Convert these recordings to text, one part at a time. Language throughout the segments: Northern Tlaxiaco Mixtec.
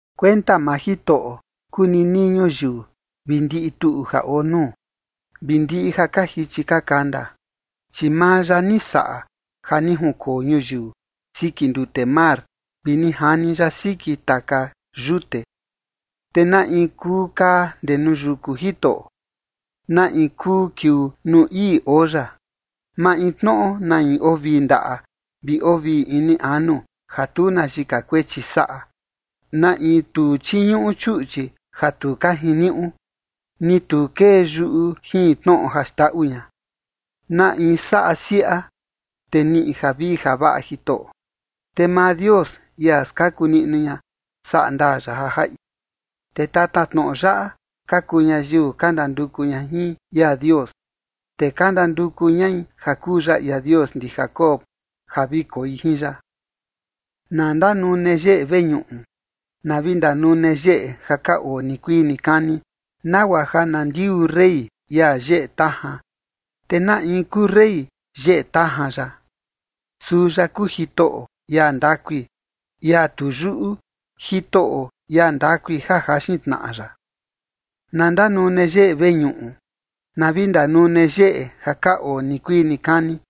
Kuenta maa Jitoꞌo kuu ninii ñuyiu vi ndiꞌi tuꞌu ja oo nuu, vi ndiꞌi ja ka jichi ka kanda. Chi maa ya ni saꞌa ja ni junkoo ñuyiu siki ndute mar vi ni jani ya siki taka yute. ¿Te na in kuu kaa ndee nuu yuku Jitoꞌo? ¿Na in kuu kiuu nuu ii oo ya? Maintnoꞌo na in oo vii ndaꞌa vi oo vii ini anu ja tu na yika kuechi saꞌa, na in tu chiñuꞌu chuꞌchi ja tu ka jiniuꞌu, ni tu kee yuꞌu jin tnoꞌo ja xndaꞌu ña. Na in saꞌa siaꞌa, te niꞌi javii javaꞌa Jitoꞌo, te maa Dios, ia skaku niꞌnu ña, saꞌa ndaa ya ja jaꞌi. Te tatatnoꞌo yaꞌa ka kuu ñayiu ka ndanduku ña jin ia Dios, te ka ndanduku ñai ja kuu ya ia Dios ndi Jacob ja vi koi jin ya. Na ndanune yeꞌe veñuꞌu, na vi ndanune yeꞌe ja ka oo nikuii nikani, nagua ja na ndiuu rey, ia yeꞌe tajan. ¿Te na in kuu rey yeꞌe tajan yaꞌa? Suu ya kuu Jitoꞌo, ia ndakui, ia tu yuꞌu, Jitoꞌo, ia ndakui ja jaxin tnaꞌa ya. Na ndanune yeꞌe veñuꞌu, na vi ndanune yeꞌe ja ka oo nikuii nikani,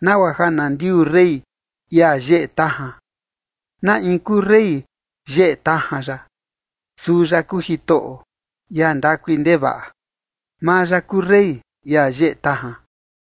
nagua ja na ndiuu rey, ia yeꞌe tajan. ¿Na in kuu rey yeꞌe tajan yaꞌa? Suu ya kuu Jitoꞌo, ia ndakui ndevaꞌa. Maa ya kuu rey, ia yeꞌe tajan.